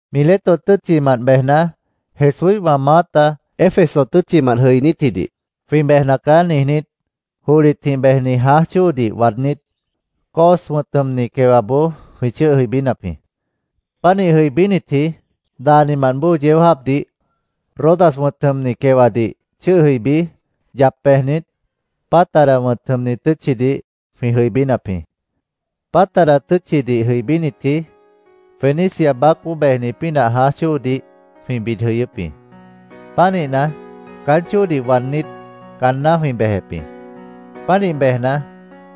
Mileto tʉ́tchimant bejna, Jesúíhwã maáta Éfeso tʉ́tchimant jʉinítjidih “Jwĩ bejna caá”, niijnít, johlitjĩh bejni jãáj chóodih waadnít, Cos wʉ̃t jʉmni quewaboó jwĩ chʉ́ʉh jʉibínap jĩ. Pánih jʉibínitji daanimant bóo yeó jáapdih Rodas wʉ̃t jʉmni quewadih chʉ́ʉh jʉibí, yap bejnit, Pátara wʉ̃t jʉmni tʉ́tchidih jwĩ jʉibínap jĩ. Pátara tʉ́tchidih jʉibínitji Fenicia baácboó bejni pínah jãáj chóodih jwĩ bid jʉyʉ́p jĩ. Pánihna, caán chóodih waadnít, caanná jwĩ bejep jĩ. Pánih bejna,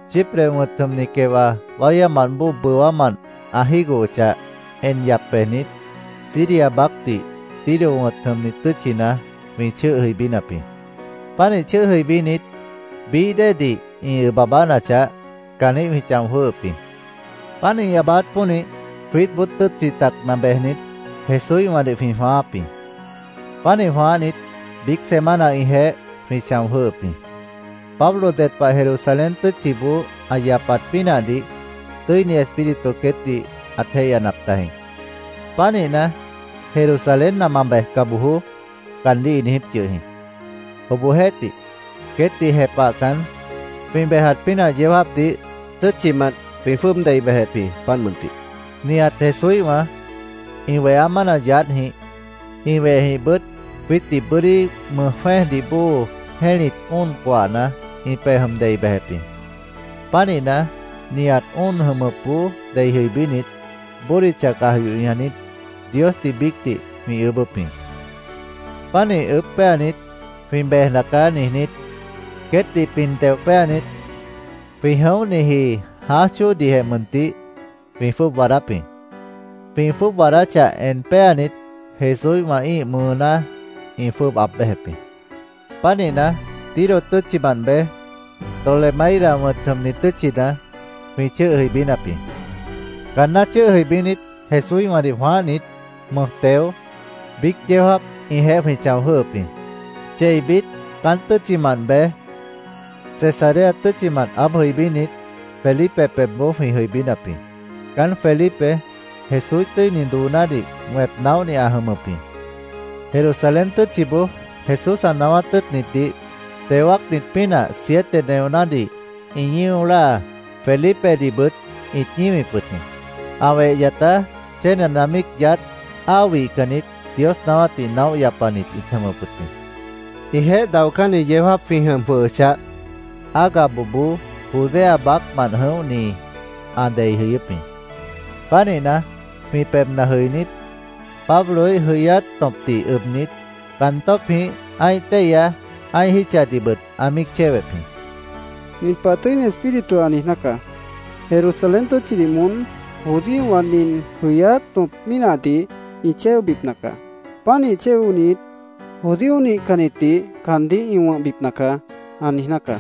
Chipre wʉ̃t jʉmni quewa wáyámant bóo bʉwámant ã jígohochah, en yap bejnit, Siria baácdih Tiro wʉ̃t jʉmni tʉ́tchina jwĩ chʉ́ʉh jʉibínap jĩ. Pánih chʉ́ʉh jʉibínit, bií déedih ĩ ʉb aabánachah, caanjĩ́h jwĩ chão jwʉ́hʉp jĩ. Páant ĩ aabáát pónih, jwiítboó tʉ́tchi tacna bejnit, Jesúíhwãdih jwĩ jwãááp jĩ. Pánih jwãáhnit, biíc semana ĩjeéh jwĩ chão jwʉ́ʉhʉp jĩ. Pablo ded pah Jerusalén tʉ́tchiboó ã yapat pínahdih Tʉ́ini Espíritu queétdih ãt jéihyanap tajĩ. Pánihna, “Jerusalénna ma bejca bojoó”, caandíh ĩ niijíp yʉh jĩ. Obohjeéhtih, queétdih jepahcan, jwĩ bejat pínah yeó jáapdih tʉ́tchimant jwĩ jwʉ́ʉb dei bejep jĩ, páant mʉntih. Nihat Jesúíhwã, ĩ weha mána yaádhjĩh, ĩ wehjĩhbʉt jwiítdih bʉ́dí mʉj jwẽ́ejdih bóo jẽ́lit óon coahna ĩ pej jʉm dei bejep jĩ. Pánihna, nihat óon jʉmʉpboó dei jʉibínit, bódicha caj yoh ñajnit, Diosdih biícdih jwĩ ʉʉ́bʉ́p jĩ. Pánih ʉʉ́bh péanit, “Jwĩ bejna caá”, niijnít, queétdih pin teo péanit, jwĩ jʉ̃óhniji jãáj chóodihjeh mʉntih jwĩ jwʉ́ʉb waadáp jĩ. Jwĩ jwʉ́ʉb waadáchah en péanit, Jesúíhwã ĩ́ih mʉʉná ĩ jwʉ́ʉb aab béjep jĩ. Pánihna, Tiro tʉ́tchimant bej, Tolemaida wʉ̃t jʉmni tʉ́tchina jwĩ chʉ́ʉh jʉibínap jĩ. Caanná chʉ́ʉh jʉibínit, Jesúíhwãdih jwãáhnit, mʉj teo, biíc yeó jáap ĩjeéh jwĩ chão jwʉ́hʉp jĩ. Cheibit caán tʉ́tchimant bej, Cesarea tʉ́tchina aáb jʉibínit, Felipe pebhboó jwĩ jʉibínap jĩ. Caán Felipe Jesúíh tʉ́ini doonádih wẽp naóhni ã jʉmʉp jĩ. Jerusalén tʉ́tchiboó Jesús ã naáwát tʉ́ʉtnitdih teo wáacnit pínah siete neonádih ĩ ñío láa, Felipedihbʉt ĩt ñíwip wʉt jĩ. Ã weh yatá chénena míic yaádh, áa wihcannit, Dios naáwátdih naóh yapanit ĩt jʉmʉp jĩ. Ĩjeéh daocánni yeó jáap jwĩ jʉm jwʉhʉchah, Agaboboó Judea baácmant jʉ̃óhni ã dei jʉyʉ́p jĩ. Pánihna, jwĩ pebhna jʉinít, Pabloíh jʉyáát tõpdih ʉbnit, caan tṍpjĩh ã́ih téihya ã́ih jítchadihbʉt ã míic chéwep jĩ. —Nin pah Tʉ́ini Espíritu ã niijná caá: ‘Jerusalén tʉ́tchidih moón judíowã nin jʉyáát tõp mínahdih ĩ chéobipna caá. Pánih chéonit, judío nihcannitdih caandíh ĩ wʉ̃hbipna caá’, ã niijná caá,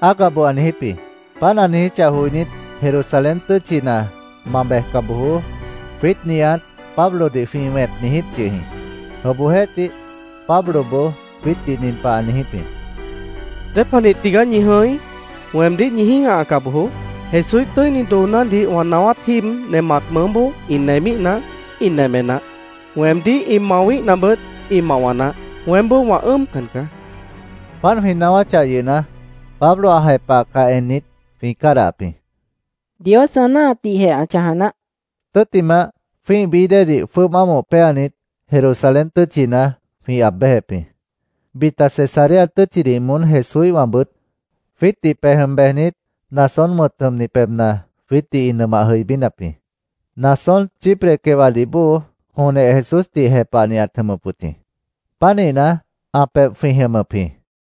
Agabo ã niijíp jĩ. Páant ã niijíchah joinít, “Jerusalén tʉ́tchina ma bejca bojoó”, jwiít nihat Pablodih jwĩ wẽp niijíp yʉh jĩ. Obohjeéhtih, Pabloboó jwiítdih nin pah ã niijíp jĩ: —¿Dépanih tigaá ñi jʉ̃í? Weemdíh ñi jĩ́gahaca bojoó. Jesúíh tʉ́ini doonádih wã naáwát jíib nemat mʉʉ́boó ĩ nemíhna, ĩ neme naáh. Weemdíh ĩ mawíhnabʉt, ĩ mawa naáh. Weémboó wã ʉ́ʉmcan caá, ã niijíp jĩ. Páant jwĩ naáwáchah yʉhna, Pablo ã jepahcah ennit, jwĩ cádahap jĩ. —Dios ã náahatdihjeh ã chãja naáh, jwĩ niijíp jĩ. Tʉ́ttimah, jwĩ́ih bií déedih jwʉ́ʉb ámoh péanit, Jerusalén tʉ́tchina jwĩ aab béjep jĩ. Bita Cesarea tʉ́tchidih moón Jesúíhwãbʉt jwiítdih pej jʉm bejnit, Mnasón wʉ̃t jʉmni pebhna jwiítdih ĩ nʉmah jʉibínap jĩ. Mnasón Chipre quewadih bóo jonjeh Jesúsdih jepahni ãt jʉmʉp wʉt jĩ. Pánihna, ã pebh jwĩ jʉmʉp jĩ.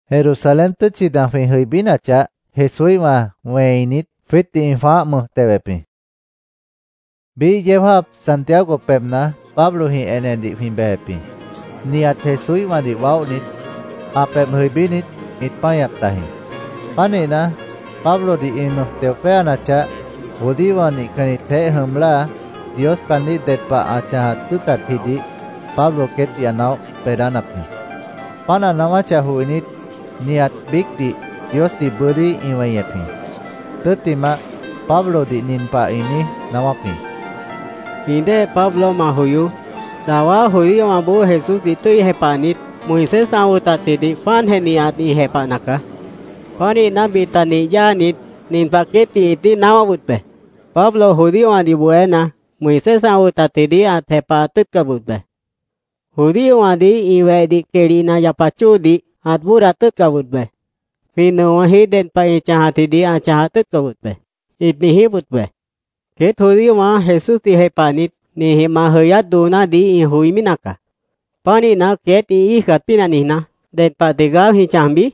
Jerusalén tʉ́tchina jwĩ jʉibínachah, Jesúíhwã wẽinit, jwiítdih ĩ jwãáh mʉj tewep jĩ. Biíh yeó jáap Santiago pebhna Pablojĩh enedih jwĩ bejep jĩ. Nihat Jesúíhwãdih waóhnit ã pebh jʉibínit, ĩt páñap tajĩ. Pánihna, Pablodih ĩ mʉj teo péanachah, judíowã nihcannitjeéh jʉm láa, Dios caandíh ded pah ã chãjat tʉ́ʉtatjidih Pablo queétdih ã naóh beedánap jĩ. Páant ã naáwáchah joinít, nihat biícdih Diosdih bʉ́dí ĩ weñep jĩ. Tʉ́ttimah, Pablodih nin pah ĩ niíj naáwáp jĩ: —Jwĩ dée Pablo, ma joyoó. Dawá judíowãboó Jesúsdih tʉ́i jepahnit, Moisés ã wʉtatjidih páantjeh nihat ĩ jepahna caá. Pánihna, bita nih yáanit, nin pah queétdih ĩt niíj naáwáp wʉt be. ‘Pablo judíowãdih bohéna, Moisés ã wʉtatjidih ãt jepahat tʉ́ʉtcap wʉt be. Judíowãdih ĩ wehdih quehli nah yapat chóodih ãt bóodat tʉ́ʉtcap wʉt be. Jwĩ nʉowãji ded pah ĩ chãjatjidih ãt chãjat tʉ́ʉtcap wʉt be’, ĩt niijíp wʉt be. Queét judíowã Jesúsdih jepahnit ninjĩh ma jʉyát doonádih ĩ joimí nacaá. ¿Pánihna, queét ĩ íijcat pínah niijná, ded pah tigaá jwĩ chãjbi?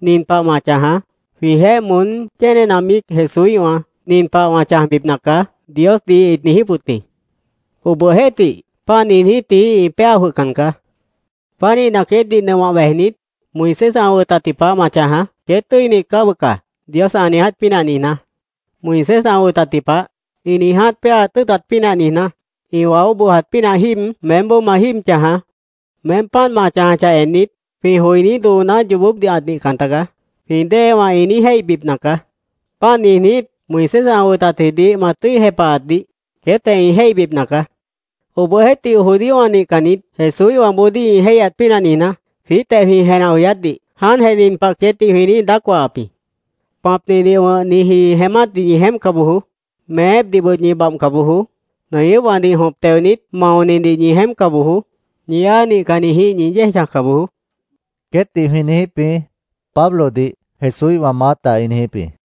Nin pah ma chãjaá: Jwĩjeéh moón chénena míic Jesúíhwã ‘Nin pah wã chãjbipna caá’, Diosdih ĩt niijíp wʉt jĩ. Obohjeéhtih, páant niijnítji ĩ péa jwʉhcan caá. Pánihna, queétdih nʉmah bejnit, Moisés ã wʉtatji pah ma chãjaá, ‘Queét tʉ́init caá bʉca’, Dios ã niiját pínah niijná. Moisés ã wʉtatji pah, ĩ niiját péaat jʉ́ʉtat pínah niijná, ĩ waó bojat pínah jíib meémboó ma jíib chãjaá. Meém páant ma chãjachah ennit, ‘Jwĩ joiní dooná yoobópdih ãt nihcan tagaá’, jwĩ déewã ĩ niíj jéihbipna caá. Páant niijnít, Moisés ã wʉtatjidih ma tʉ́i jepahatdih queétjeh ĩ jéihbipna caá. Obohjeéhtih, judíowã nihcannit Jesúíhwãboodíh ĩ jéihyat pínah niijná, jwiítjeh jwĩ jenah joyátdih jáantjeh nin pah queétdih jwĩ niíj daác wahap jĩ: ‘Pãpnidih wʉ̃hniji jeémátdih ñi jeémpca bojoó. Meépdihbʉt ñi babhca bojoó. Nʉñʉ́pwãdih jõp teonit maonidih ñi jeémpca bojoó. Ñi áa nihcannitjĩh ñi yéej chãjca bojoó’, queétdih jwĩ niijíp jĩ, Pablodih Jesúíhwã maáta ĩ niijíp jĩ.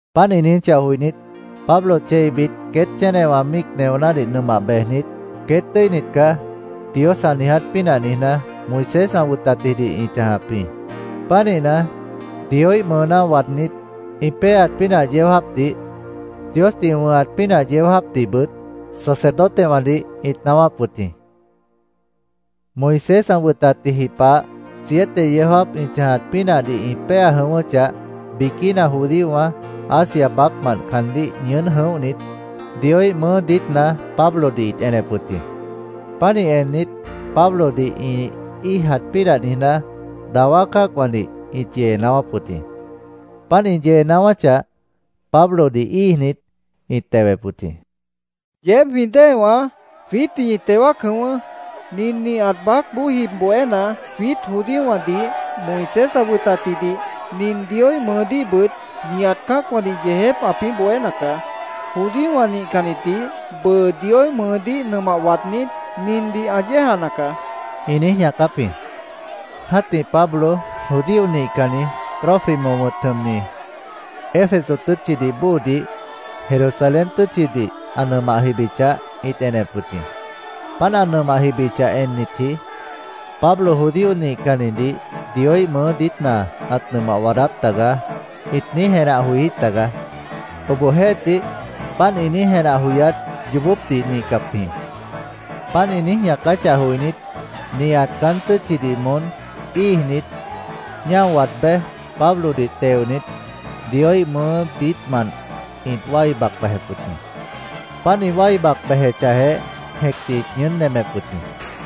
Páant ĩ niijíchah joinít, Pablo cheibit queét chénena míic neonádih nʉmah bejnit, “Queét tʉ́init caá”, Dios ã niiját pínah niijná, Moisés ã wʉtatjidih ĩ chãjap jĩ. Pánihna, Dioíh mʉʉná waadnít, ĩ péaat pínah yeó jáapdih, Diosdih ĩ wʉ̃hat pínah yeó jáapdihbʉt sacerdotewãdih ĩt naáwáp wʉt jĩ. Moisés ã wʉtatji pah siete yeó jáap ĩ chãjat pínahdih ĩ péa jʉ̃ʉ́wʉ́chah, biquína judíowã Asia baácmant caandíh ñʉʉ́n jʉ̃óhnit, Dioíh mʉʉ́ diítna Pablodih ĩt enep wʉt jĩ. Pánih ennit, Pablodih ĩ íijat pínah niijná, dawá cã́acwãdih ĩt yee naáwáp wʉt jĩ. Páant ĩ yee naáwáchah, Pablodih íijnit, ĩt tewep wʉt jĩ. “Yeéb jwĩ déewãá, jwiítdih ñi teo wáac jʉ̃ʉ́wʉ́. Nin nihat baácboó jib bohéna, jwiít judíowãdih, Moisés ã wʉtatjidih, nin Dioíh mʉʉdíhbʉt nihat cã́acwãdih yeejép ãpĩ́ bohéna caá. Judíowã nihcannitdih bʉʉ Dioíh mʉʉdíh nʉmah waadnít, nindih ã yéejana caá”, ĩ niíj ñaacáp jĩ. Jã́tih Pablo judío nihcanni Trófimo wʉ̃t jʉmni, Éfeso tʉ́tchidih bóodih Jerusalén tʉ́tchidih ã nʉmah jibichah, ĩt enep wʉt jĩ. Páant ã nʉmah jibichah ennitji “Pablo judío nihcannidih Dioíh mʉʉ́ diítna ãt nʉmah waadáp tagaá”, ĩt niíj jenah joijí tagaá. Obohjeéhtih, páant ĩ niíj jenah joyát yoobópdih nihcap jĩ. Páant ĩ niíj ñaacáchah joinít, nihat caán tʉ́tchidih moón íijnit, ñáo waad béj, Pablodih teonit, Dioíh mʉʉ́ diítmant ĩt wái bac bejep wʉt jĩ. Páant ĩ wái bac bejechahjeh, jẽcdih ĩt ñʉʉ́n nemep wʉt jĩ.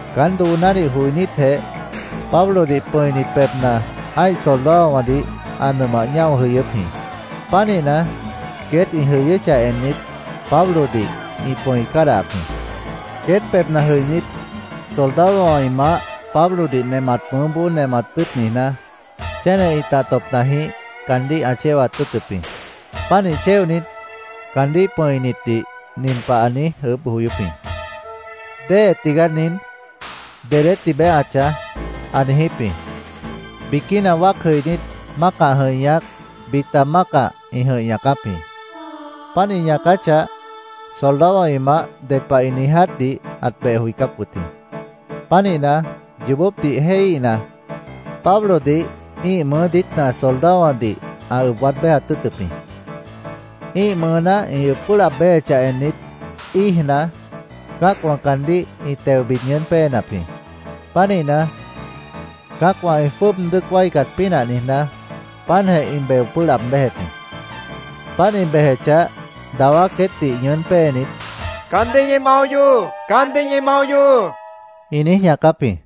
Caán doonádih joinítjeh, Pablodih pʉ̃init pebhna ã́ih soldadowãdih ã nʉmah ñáo jʉyʉ́p jĩ. Pánihna, queét ĩ jʉyʉ́chah ennit, Pablodih ĩ pʉ̃i cádahap jĩ. Queét pebhna jʉinít, soldadowã ĩ maáh Pablodih nemat mʉʉ́boó nemat tʉ́ʉt niijná, chéne ĩtah tõpnajĩh caandíh ã chéwat tʉ́ʉtʉp jĩ. Pánih chéonit, caandíh pʉ̃initdih nin pah ã niíj ʉʉ́bh joyóp jĩ: “¿Déhe tigaá nin? ¿Dedé tibeé ã chãj?” ã niijíp jĩ. Biquína wáac jʉinít mácah jʉ̃ih ñaác, bita mácah ĩ jʉ̃ih ñaacáp jĩ. Páant ĩ ñaacáchah, soldadowã ĩ maáh ded pah ĩ niijátdih ãt beh joicáp wʉt jĩ. Pánihna, yoobópdih jéihíhna, Pablodih ĩ́ih mʉʉ́ diítna soldadowãdih ã ʉb waad béjat tʉ́ʉtʉp jĩ. Ĩ́ih mʉʉná ĩ ʉb pʉ́ʉh laab béjechah ennit, íijna, cã́acwã caandíh ĩ teo bid ñʉʉ́n péenap jĩ. Pánihna, cã́acwã ĩ jwʉ́ʉb dʉ́ʉc wáicat pínah niijná, páantjeh ĩ beo pʉ́ʉh laab béjep jĩ. Páant ĩ bejechah, dawá queétdih ñʉʉ́n péenit, “¡Caandíh ñi mao yohoó! ¡Caandíh ñi mao yohoó!” ĩ niíj ñaacáp jĩ.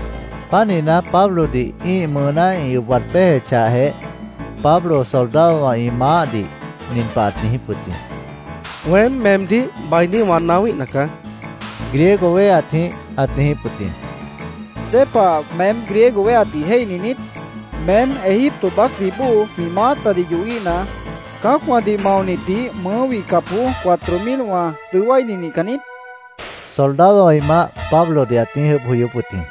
Pánihna, Pablodih ĩ́ih mʉʉná ĩ ʉb waad béjechahjeh, Pablo soldadowã ĩ maáhdih nin pah ãt niijíp wʉt jĩ: —Weém meemdíh bainí wã naáwíhna caá, Griego wéheatjĩh ãt niijíp wʉt jĩ. —¿Dépah meém Griego wéheatdih jéihni niít? ¿Meém Egipto baácdih bóo jwĩ maátadih yohíhna, cã́acwãdih maonitdih mʉʉ́ wihcapboó cuatro milwã dʉó wáini nihcan niít? soldadowã ĩ maáh Pablodih ãt niíj ʉʉ́bh joyóp wʉt jĩ.